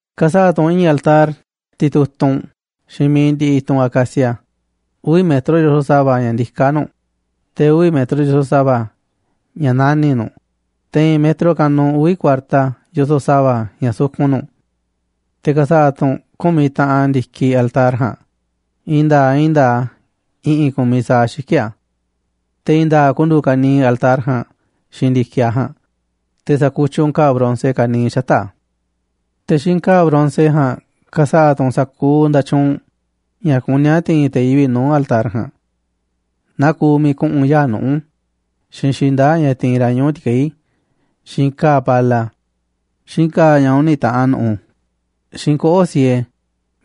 ’Ka̱sa̱ꞌa̱ tu̱ u̱nꞌ i̱i̱n altar titutunꞌ xiinꞌ mi̱iꞌ ndiꞌiꞌ i̱tunꞌ acacia. Uvi̱ metro yoso̱ꞌ sa̱va̱ ña̱ ndiká nu̱ꞌ, te̱ uvi̱ metro yoso̱ꞌ sa̱va̱ ña̱ nani̱ꞌ nu̱ꞌ, te̱ i̱i̱n metro kanuꞌ uvi̱ kuarta yoso̱ꞌ sa̱va̱ ña̱ sukun nu̱ꞌ. Te̱ ka̱sa̱ꞌa̱ tu̱ u̱nꞌ ku̱miꞌ taꞌan ndi̱kiꞌ altar ja̱a̱nꞌ, i̱i̱n nda̱a̱ꞌ i̱i̱n nda̱a̱ꞌ a̱ i̱ꞌi̱n ku̱miꞌ sa̱aꞌ xiki̱ꞌ a̱. Te̱ i̱i̱n nda̱a̱ꞌ ku̱ndu̱u̱ ka̱niiꞌ altar ja̱a̱nꞌ xiinꞌ ndi̱kiꞌ a̱ ja̱a̱nꞌ, te̱ sa̱kutyiꞌ u̱nꞌ ka̱a̱ bronce ka̱niiꞌ xata̱ꞌ a̱. Te̱ xiinꞌ ka̱a̱ bronce ja̱a̱nꞌ ka̱sa̱ꞌa̱ tu̱ u̱nꞌ sa̱kuuꞌ nda̱tyuunꞌ ña̱ kuní a̱ ti̱i̱n te̱ yivi̱ꞌ nuu̱ꞌ altar ja̱a̱nꞌ, naa kuuꞌ miiꞌ ku̱ꞌu̱n yaa̱ꞌ nuꞌu̱, xiinꞌ xinda̱ꞌ ña̱ ti̱i̱n ra̱ ñuꞌu̱ ti̱keí, xiinꞌ ka̱a̱ pala, xiinꞌ ka̱a̱ ña̱ uni̱ taꞌan nu̱ꞌu̱, xiinꞌ koꞌo̱ꞌ siee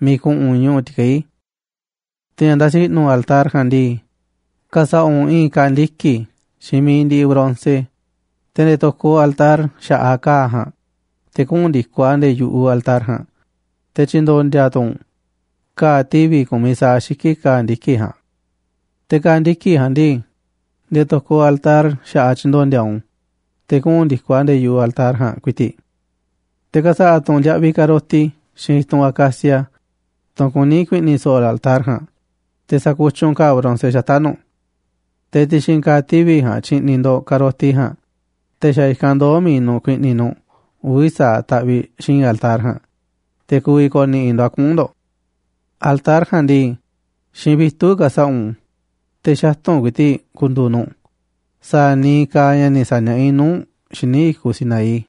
miiꞌ ku̱ꞌu̱n ñuꞌu̱ ti̱keí. Te̱ ña̱ nda̱si̱ i̱ꞌnu̱ altar ja̱a̱nꞌ ndii, ka̱sa̱ꞌa̱ u̱nꞌ i̱i̱n ka̱a̱ ndiki̱ xiinꞌ mi̱iꞌ ndiꞌiꞌ bronce. Te̱ nde̱e̱ to̱koꞌ altar xa̱ꞌaꞌ ka̱a̱ ja̱a̱nꞌ te̱ kuꞌu̱n ndi̱koꞌ a̱ nde̱e̱ yu̱ꞌuꞌ altar ja̱a̱nꞌ, te̱ tyi̱ndo̱ndi̱a̱ tu̱ u̱nꞌ ka̱a̱ tivi̱ ku̱miꞌ sa̱aꞌ xiki̱ꞌ ka̱a̱ ndiki̱ ja̱a̱nꞌ. Te̱ ka̱a̱ ndiki̱ ja̱a̱nꞌ ndii, nde̱e̱ to̱koꞌ altar xa̱ꞌaꞌ tyi̱ndo̱ndi̱a̱ u̱nꞌ u̱n te̱ kuꞌu̱n ndi̱koꞌ a̱ nde̱e̱ yu̱ꞌuꞌ altar ja̱a̱nꞌ ku̱i̱ti̱ꞌ. Te̱ ka̱sa̱ꞌa̱ tu̱ u̱nꞌ ndiaꞌviꞌ ka̱roti xiinꞌ i̱tunꞌ acacia, tunꞌ kuní ku̱i̱ꞌni̱ so̱ꞌo̱ altar ja̱a̱nꞌ, te̱ sa̱kutyiꞌ u̱nꞌ ka̱a̱ bronce xata̱ꞌ nu̱ꞌ. Te̱ ti̱xi̱n ka̱a̱ tivi̱ ja̱a̱nꞌ tyi̱ꞌni̱ ndo̱ꞌ ka̱roti ja̱a̱nꞌ, te̱ xa̱ i̱kanꞌ ndoo̱ mi̱iꞌ nu̱ꞌ ku̱i̱ꞌni̱ nu̱ꞌ uvi̱ sa̱aꞌ taꞌviꞌ xi̱i̱nꞌ altar ja̱a̱nꞌ, te̱ ku̱vi̱ ko̱ni̱ꞌi̱ ndo̱ꞌ a̱ kuꞌu̱n ndo̱ꞌ. Altar ja̱a̱nꞌ ndii xiinꞌ vitu̱ꞌ ka̱sa̱ꞌa̱ u̱nꞌ u̱n, te̱ xatu̱nꞌ ku̱i̱ti̱ꞌ ku̱ndu̱u̱ nu̱ꞌ sa̱a̱ niiꞌ kaaꞌ ña̱ ni̱ sa̱niaꞌá i̱ nuu̱ꞌ u̱nꞌ xíniꞌ i̱kuꞌ Sinaí.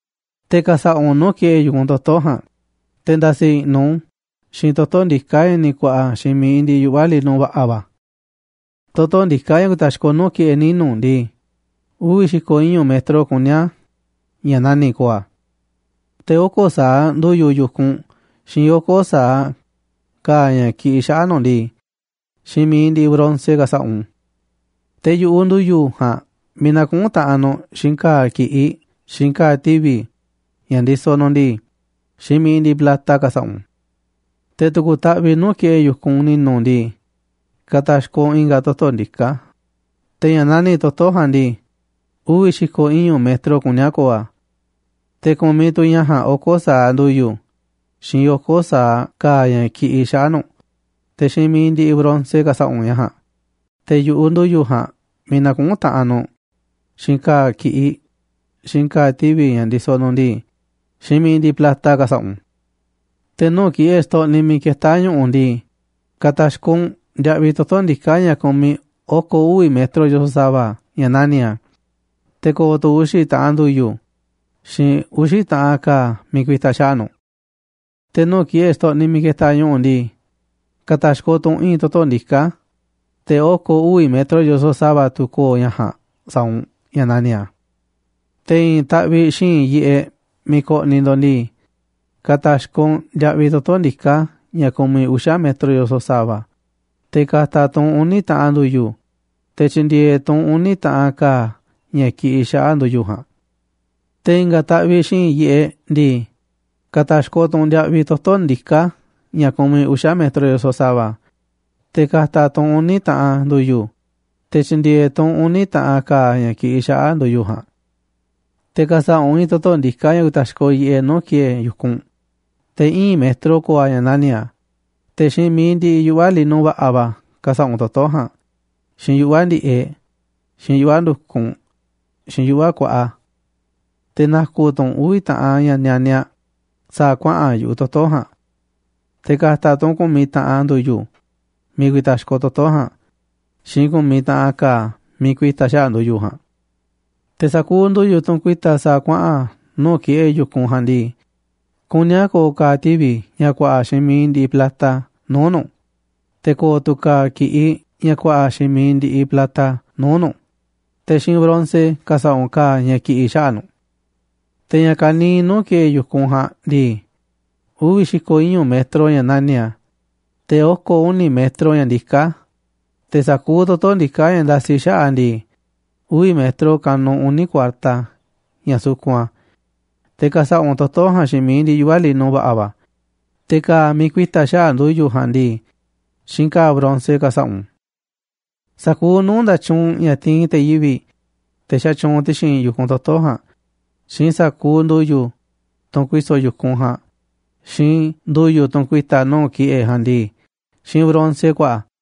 ’Te̱ ka̱sa̱ꞌa̱ u̱nꞌ nuu̱ꞌ ki̱ꞌe̱ yu̱kunꞌ toto̱ ja̱a̱nꞌ, te̱ nda̱si̱ i̱ꞌnu̱ u̱nꞌ u̱n xiinꞌ toto̱ ndiká ña̱ ni̱ ku̱a̱ꞌa̱ xiinꞌ mi̱iꞌ ndiꞌiꞌ yuꞌva̱ lino va̱ꞌa̱ va̱. Toto̱ ndiká ña̱ ku̱ta̱xkoꞌ nuu̱ꞌ ki̱ꞌe̱ ninu̱ ndii, uvi̱ xi̱ko̱ iñu̱ metro kuní a̱ ña̱ nani̱ꞌ ko̱o̱ a̱. Te̱ oko̱ sa̱aꞌ ndu̱yu̱ yu̱kunꞌ, xiinꞌ oko̱ sa̱aꞌ ka̱a̱ ña̱ kiꞌiꞌ xaꞌa̱ꞌ nu̱ꞌ ndii, xiinꞌ mi̱iꞌ ndiꞌiꞌ bronce ka̱sa̱ꞌa̱ u̱nꞌ u̱n, te̱ yu̱ꞌuꞌ ndu̱yu̱ ja̱a̱nꞌ miiꞌ nakuꞌún taꞌanꞌ nu̱ꞌ, xiinꞌ ka̱a̱ ki̱ꞌiꞌ, xiinꞌ ka̱a̱ tivi̱ꞌ ña̱ ndisoꞌ nu̱ꞌ ndii, xiinꞌ mi̱iꞌ ndiꞌiꞌ plata ka̱sa̱ꞌa̱ u̱nꞌ u̱n. Te̱ tu̱ku̱ taꞌviꞌ nuu̱ꞌ ki̱ꞌe̱ yu̱kunꞌ ni̱nu̱ ndii, ka̱ta̱xkoꞌ u̱nꞌ i̱nga̱ toto̱ ndiká, te̱ ña̱ nani̱ꞌ toto̱ ja̱a̱nꞌ ndii, uvi̱ xi̱ko̱ iñu̱ metro kuní a̱ ko̱o̱ a̱. Te̱ ku̱miꞌ tu̱ ña̱ ja̱a̱nꞌ oko̱ sa̱aꞌ ndu̱yu̱ xiinꞌ oko̱ sa̱aꞌ ka̱a̱ ña̱ kiꞌiꞌ xaꞌa̱ꞌ nu̱ꞌ. Te̱ xiinꞌ mi̱iꞌ ndiꞌiꞌ bronce ka̱sa̱ꞌa̱ u̱nꞌ ña̱ ja̱a̱nꞌ, te̱ yu̱ꞌuꞌ ndu̱yu̱ ja̱a̱nꞌ miiꞌ nakuꞌún taꞌanꞌ nu̱ꞌ, xiinꞌ ka̱a̱ ki̱ꞌiꞌ, xiinꞌ ka̱a̱ tivi̱ ña̱ ndisoꞌ nu̱ꞌ ndii, xiinꞌ mi̱iꞌ ndiꞌiꞌ plata ka̱sa̱ꞌa̱ u̱nꞌ u̱n. Te̱ nuu̱ꞌ ki̱ꞌe̱ xtoꞌniꞌ miiꞌ ketá ñu̱ꞌu̱ ndii, ka̱ta̱xkoꞌ u̱nꞌ ndiaꞌviꞌ toto̱ ndiká ña̱ kumiꞌ oko̱ uvi̱ metro yoso̱ꞌ sa̱va̱ ña̱ nani̱ꞌ a̱, te̱ ko̱o̱ tu̱ uxi̱ taꞌan ndu̱yu̱ xiinꞌ uxi̱ taꞌan ka̱a̱ miiꞌ ku̱i̱ta̱ xaꞌa̱ꞌ nu̱ꞌ. Te̱ nuu̱ꞌ ki̱ꞌe̱ xtoꞌniꞌ miiꞌ ketaꞌ ñu̱ꞌu̱ ndii, ka̱ta̱xkoꞌ tu̱ u̱nꞌ i̱i̱n toto̱ ndiká, te̱ oko̱ uvi̱ metro yoso̱ꞌ sa̱va̱ tu̱ ko̱o̱ ña̱ ja̱a̱nꞌ sa̱a̱ u̱nꞌ ña̱ nani̱ꞌ a̱. Te̱ i̱i̱n taꞌviꞌ xi̱i̱nꞌ yiꞌeꞌ miiꞌ koꞌniꞌ ndo̱ꞌ ndii, ka̱ta̱xkoꞌ u̱nꞌ ndiaꞌviꞌ toto̱ ndiká ña̱ ku̱miꞌ uxa̱ metro yoso̱ꞌ sa̱va̱, te̱ ka̱ta̱ tu̱ u̱nꞌ uni̱ taꞌan ndu̱yu̱, te̱ tyi̱ndi̱e̱e̱ tu̱ u̱nꞌ uni̱ taꞌan ka̱a̱ ña̱ ki̱ꞌi̱ xaꞌa̱ꞌ ndu̱yu̱ ja̱a̱nꞌ. Te̱ i̱nga̱ taꞌviꞌ xi̱i̱nꞌ yiꞌeꞌ ndii, ka̱ta̱xkoꞌ tu̱ u̱nꞌ ndiaꞌviꞌ toto̱ ndiká ña̱ ku̱miꞌ uxa̱ metro yoso̱ꞌ sa̱va̱, te̱ ka̱ta̱ tu̱ u̱nꞌ uni̱ taꞌan ndu̱yu̱, te̱ tyi̱ndi̱e̱e̱ tu̱ u̱nꞌ uni̱ taꞌan ka̱a̱ ña̱ ki̱ꞌi̱ xaꞌa̱ꞌ ndu̱yu̱ ja̱a̱nꞌ. ’Te̱ ka̱sa̱ꞌa̱ u̱nꞌ i̱i̱n toto̱ ndiká ña̱ ku̱ta̱xkoꞌ yiꞌeꞌ nuu̱ꞌ ki̱ꞌe̱ yu̱kunꞌ. Te̱ íin metro ko̱o̱ a̱ ña̱ nani̱ꞌ a̱, te̱ xiinꞌ mi̱iꞌ ndiꞌiꞌ yuꞌva̱ lino va̱ꞌa̱ va̱ ka̱sa̱ꞌa̱ u̱nꞌ toto̱ ja̱a̱nꞌ, xiinꞌ yuꞌva̱ ndi̱ꞌeꞌ, xiinꞌ yuꞌva̱ ndu̱kunꞌ, xiinꞌ yuꞌva̱ kuaꞌa. Te̱ na̱ku̱ tu̱ u̱nꞌ uvi̱ taꞌan ña̱ nianiaꞌ sa̱a̱ kuaꞌa̱n yu̱ꞌuꞌ toto̱ ja̱a̱nꞌ. Te̱ ka̱ta̱ tu̱ u̱nꞌ ku̱miꞌ taꞌan ndu̱yu̱ miiꞌ ku̱i̱ta̱xkoꞌ toto̱ ja̱a̱nꞌ xiinꞌ ku̱miꞌ taꞌan ka̱a̱ miiꞌ ku̱i̱ta̱ xaꞌa̱ꞌ ndu̱yu̱ ja̱a̱nꞌ. Te̱ sa̱kuuꞌ ndu̱yu̱, tunꞌ ku̱i̱ta̱ sa̱a̱ kuaꞌa̱n nuu̱ꞌ ki̱ꞌe̱ yu̱kunꞌ ja̱a̱nꞌ ndii, kuní a̱ ko̱o̱ ka̱a̱ tivi̱ ña̱ ku̱a̱ꞌa̱ xiinꞌ mi̱iꞌ ndiꞌiꞌ plata nuu̱ꞌ nu̱ꞌ, te̱ ko̱o̱ tu̱ ka̱a̱ ki̱ꞌiꞌ ña̱ ku̱a̱ꞌa̱ xiinꞌ mi̱iꞌ ndiꞌiꞌ plata nuu̱ꞌ nu̱ꞌ, te̱ xiinꞌ bronce ka̱sa̱ꞌa̱ u̱nꞌ ka̱a̱ ña̱ ki̱ꞌi̱ xaꞌa̱ꞌ nu̱ꞌ. Te̱ ña̱ ka̱niiꞌ nuu̱ꞌ ki̱ꞌe̱ yu̱kunꞌ ja̱a̱nꞌ ndii, uvi̱ xi̱ko̱ iñu̱ metro ña̱ nani̱ꞌ a̱, te̱ oko̱ uni̱ metro ña̱ ndiká a̱, te̱ sa̱kuuꞌ toto̱ ndiká ña̱ nda̱si̱ xaꞌa̱ꞌ a̱ ndii, uvi̱ metro kanuꞌ uni̱ kuarta ña̱ sukun a̱, te̱ ka̱sa̱ꞌa̱ u̱nꞌ toto̱ ja̱a̱nꞌ xiinꞌ mi̱iꞌ ndiꞌiꞌ yuꞌva̱ lino va̱ꞌa̱ va̱, te̱ ka̱a̱ miiꞌ ku̱i̱ta̱ xaꞌa̱ꞌ ndu̱yu̱ ja̱a̱nꞌ ndii, xiinꞌ ka̱a̱ bronce ka̱sa̱ꞌa̱ u̱nꞌ u̱n. ’Sa̱kuuꞌ nuu̱ꞌ nda̱tyuunꞌ ña̱ tiinꞌ te̱ yivi̱ꞌ, te̱ xatyuunꞌ ti̱xi̱n yu̱kunꞌ toto̱ ja̱a̱nꞌ xiinꞌ sa̱kuuꞌ ndu̱yu̱, tunꞌ ku̱i̱so̱ yu̱kunꞌ ja̱a̱nꞌ, xiinꞌ ndu̱yu̱, tunꞌ ku̱i̱ta̱ nuu̱ꞌ ki̱ꞌe̱ ja̱a̱nꞌ ndii, xiinꞌ bronce ku̱a̱ꞌa̱ a̱.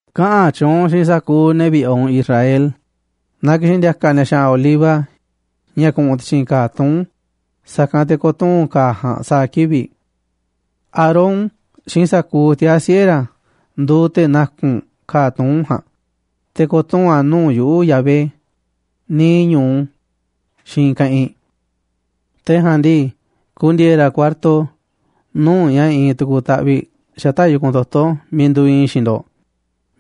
’Kaꞌa̱n tyuunꞌ u̱nꞌ xiinꞌ sa̱kuuꞌ ne̱ vi̱ꞌe̱ u̱nꞌ Israel na ki̱xi̱n ndi̱a̱ka̱ ni̱a̱ xa̱ꞌa̱n oliva ña̱ ku̱ꞌu̱n ti̱xi̱n ka̱a̱ tuún, sa̱kanꞌ te̱ ko̱tuu̱n ka̱a̱ ja̱a̱nꞌ sa̱a̱ kivi̱ꞌ. Aarón xiinꞌ sa̱kuuꞌ tiaa̱ siꞌe̱ ra̱ nduuꞌ te̱ na̱ku̱nꞌ ka̱a̱ tuún ja̱a̱nꞌ, te̱ ko̱tuu̱n a̱ nuu̱ꞌ yuꞌu̱ꞌ, Yahvé, niiꞌ ñu̱u xiinꞌ i̱i̱n keꞌinꞌ. Te̱ ja̱a̱nꞌ ndii, ku̱ndi̱e̱e̱ ra̱ kuarto nu̱uꞌ ña̱ iinꞌ tu̱ku̱ taꞌviꞌ xata̱ꞌ yu̱kunꞌ toto̱ miiꞌ nduuꞌ iinꞌ i̱ xiinꞌ ndo̱ꞌ,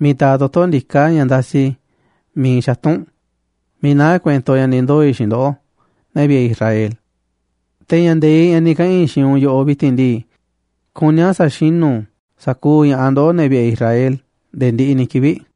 miiꞌ taaꞌ toto̱ ndiká ña̱ ndasiꞌ miiꞌ iinꞌ xatu̱nꞌ, miiꞌ naá kuento ña̱ ni̱ ndoo̱ i̱ xiinꞌ ndoꞌó, ne̱ vi̱ꞌe̱ Israel. Te̱ ña̱ nde̱iꞌ, ña̱ ni̱ kaꞌa̱n i̱ xiinꞌ u̱nꞌ yoꞌoꞌ vi̱ti̱n ndii, kuní a̱ sa̱xinu̱ sa̱kuuꞌ ña̱ꞌaꞌ ndoꞌóꞌ, ne̱ vi̱ꞌe̱ Israel, nde̱e̱ ndiꞌiꞌ ni̱ kivi̱ꞌ.